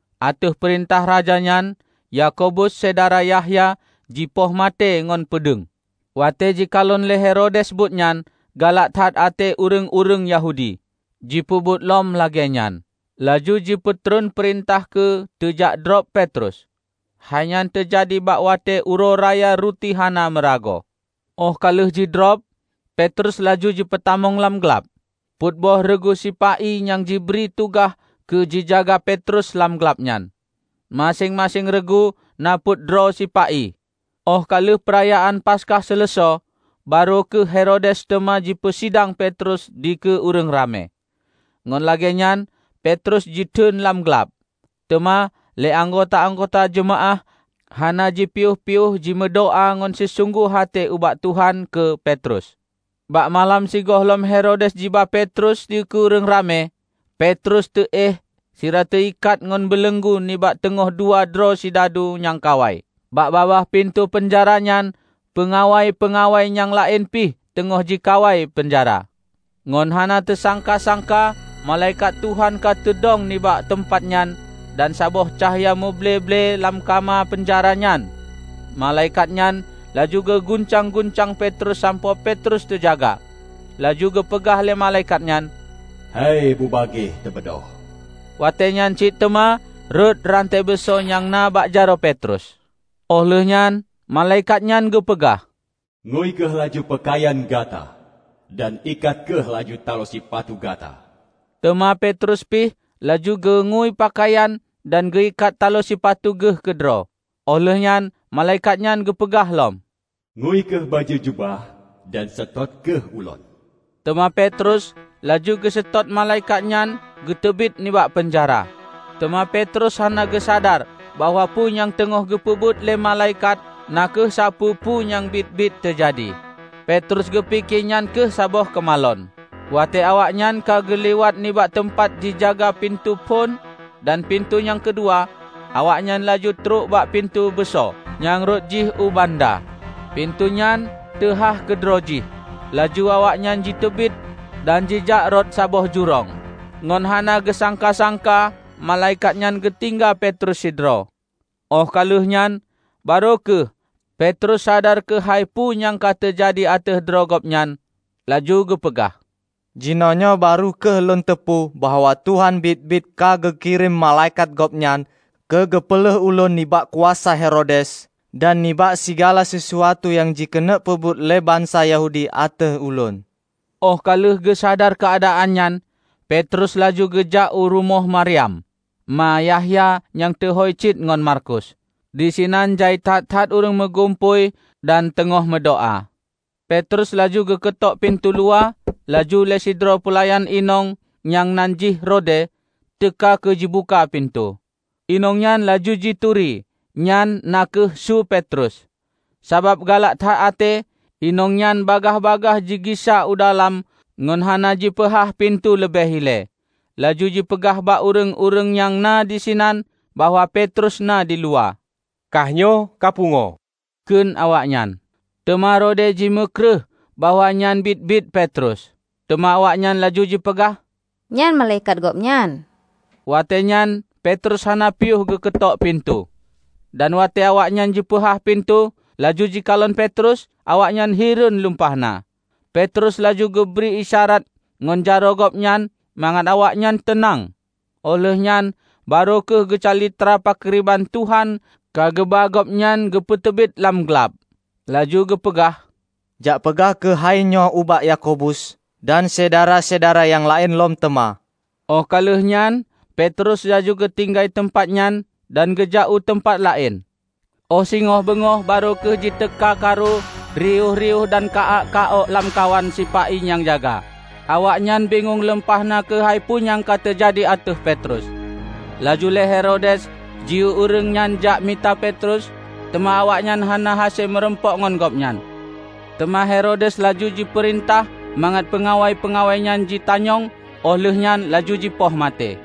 Ateueh peurintah raja nyan, Yakobus, syedara Yahya jipoh maté ngon peudeueng. Watée jikalon lé Herodes buet nyan galak that até ureuëng-ureuëng Yahudi, jipeubuet lom lagée nyan; laju jipeutreun peurintah keu teujakdrob Petrus. Hai nyan teujadi bak watée Uroe Raya Ruti Hana Meuragoe. Óh ka lheueh jidrob, Petrus laju jipeutamong lam glab. Peuet boh reugu sipa-i nyang jibri tugaih keu jijaga Petrus lam glab nyan -- maséng-maséng reugu na peuet droe sipa-i. Óh ka lheueh peurayaan Paskah seuleusoe, barô kheueh Herodes teuma jipeusidang Petrus dikeue ureuëng ramé. Ngon lagée nyan Petrus jiteuen lam glab; teuma lé anggota-anggota jeumaáh hana jipiôh-piôh jimeudoá ngon sisunggoh até ubak Tuhan keu Petrus. Bak malam sigohlom Herodes jiba Petrus dikeue ureuëng ramé, Petrus teuéh sira teuikat ngon beuleunggu nibak teungoh dua droe sidadu nyang kawai. Bak babah pintoe peunjara nyan, peungawai-peungawai nyang laén pih teungoh jikawai peunjara. Ngon hana teusangka-sangka malaikat Tuhan ka teudong nibak teumpat nyan dan saboh cahya muble-ble lam kama peunjara nyan. Malaikat nyan laju geuguncang-guncang Petrus sampoe Petrus teujaga. Laju geupeugah lé malaikat nyan, "Hai, bubagaih tabeudôh!" Watée nyan cit teuma rhot rante beuso nyang na bak jaroe Petrus. Óh lheueh nyan malaikat nyan geupeugah, "Ngui kheueh laju peukayan gata dan ikat kheueh laju talo sipatu gata." Teuma Petrus pih laju geungui peukayan dan geuikat talo sipatu geuh keudroe. Óh lheueh nyan malaikat nyan geupeugah lom, "Ngui kheueh bajée jubah dan seutôt kheueh ulôn." Teuma Petrus laju geuseutôt malaikat nyan geuteubiet nibak peunjara. Teuma Petrus hana geusadar bahwa peue nyang teungoh geupeubuet lé malaikat na kheueh sapeue-peue nyang biet-biet teujadi. Petrus geupike nyan kheueh saboh keumalon. Watée awaknyan ka geulewat nibak teumpat jijaga pintoe phon dan pintoe nyang keudua, awaknyan laju trok bak pintoe beuso, nyang rhot jih u banda. Pintoe nyan teuhah keudroe jih, laju awaknyan jiteubiet dan jijak rot saboh jurông. Ngon hana geusangka-sangka malaikat nyan geutinggai Petrus sidroe. Óh ka lheueh nyan barô kheueh Petrus sadar keuhai peue nyang ka teujadi ateueh droe gobnyan, laju geupeugah, "Jinoenyoe barô kheueh lôn teupeue bahwa Tuhan biet-biet ka geukirém malaikat Gobnyan keu geupeulheuh ulôn nibak kuasa Herodes dan nibak sigala sisuatu nyang jikeuneuk peubuet lé bansa Yahudi ateueh ulôn." Óh ka lheueh geusadar keuadaan nyan, Petrus laju geujak u rumoh Maryam, ma Yahya nyang teuhôi cit ngon Markus. Disinan jai that-that ureuëng meugumpôi dan teungoh meudoá. Petrus laju geukeutok pintoe luwa, laju lé sidroe peulayan inong nyang nan jih Rode, teuka keu jibuka pintoe. Inong nyan laju jituri nyan na kheueh su Petrus. Sabab galak that até, inong nyan bagaih-bagaih jigisa u dalam ngon hana jipeuhah pintoe leubeh ilée, laju jipeugah bak ureuëng-ureuëng nyang na disinan bahwa Petrus na diluwa. "Kah nyoe ka pungoe!" kheun awaknyan. Teuma Rode jimeukreueh bahwa nyan biet-biet Petrus. Teuma awaknyan laju jipeugah, "Nyan malaikat gobnyan!" Watée nyan Petrus hana piôh geukeutok pintoe. Dan watée awaknyan jipeuhah pintoe, laju jikalon Petrus, awaknyan hireuen lumpah na. Petrus laju geubri isyarat ngon jaroe gobnyan mangat awaknyan teunang, óh lheueh nyan barô kheueh geucalitra pakriban Tuhan ka geuba gobnyan geupeuteubiet lam glab. Laju geupeugah, "Jak peugah kheueh hainyoe ubak Yakobus dan syedara-syedara nyang laén lom teuma." Óh ka lheueh nyan Petrus laju geutinggai teumpat nyan dan geujak u teumpat laén. Óh singoh beungoh barô kheueh jiteuka karu riôh-riôh dan ka-ak ka-ok lamkawan sipa-i nyang jaga. Awaknyan bingong lumpah na keuhai peue nyang ka teujadi ateueh Petrus. Laju lé Herodes jiyue ureuëng jak mita Petrus, teuma awaknyan hana hase meurumpok ngon gobnyan. Teuma Herodes laju jipeurintah mangat peungawai-peungawai nyan jitanyong óh lheueh nyan laju jipoh maté.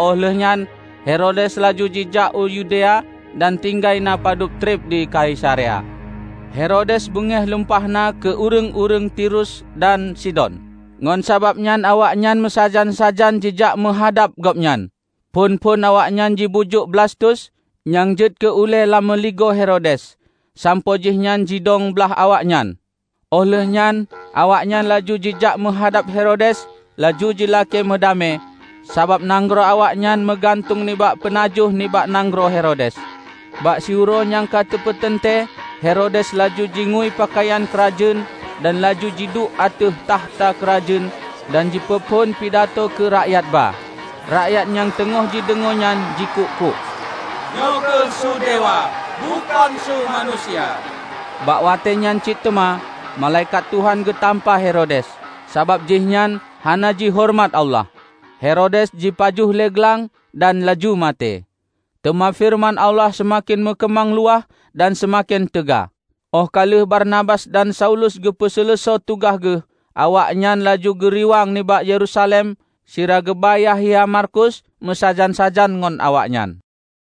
Óh lheueh nyan Herodes laju jijak u Yudea dan tinggai na padub treb di Kaisarea. Herodes beungéh lumpah na keu ureuëng-ureuëng Tirus dan Sidon. Ngon sabab nyan awaknyan meusajan-sajan jijak meuhadab gobnyan. Phon-phon awaknyan jibujuk Blastus, nyang jeuet keu ulée lam meuligoe Herodes, sampoe jihnyan jidong blaih awaknyan. Óh lheueh nyan awaknyan laju jijak meuhadab Herodes, laju jilakée meudamé, sabab nanggroe awaknyan meugantung nibak peunajoh nibak nanggroe Herodes. Bak siuroe nyang ka teupeuteuntée, Herodes laju jingui peukayan keurajeuen dan laju jiduek ateueh takhta keurajeuen dan jipeuphon pidatoe dikeue rakyat ba. Rakyat nyang teungoh jideungoe nyan jikuk-kuk, "Nyoe kheueh su dewa, bukon su manusia!" Bak watée nyan cit teuma malaikat Tuhan geutampa Herodes, sabab jihnyan hana jihoreumat Allah. Herodes jipajoh lé glang dan laju maté. Teuma feureuman Allah seumaken meukeumang luwah dan seumaken teuga. Óh ka lheueh Barnabas dan Saulus geupeu seuleusoe tugaih geuh, awaknyan laju geuriwang nibak Yerusalem sira geuba Yahya Markus meusajan-sajan ngon awaknyan.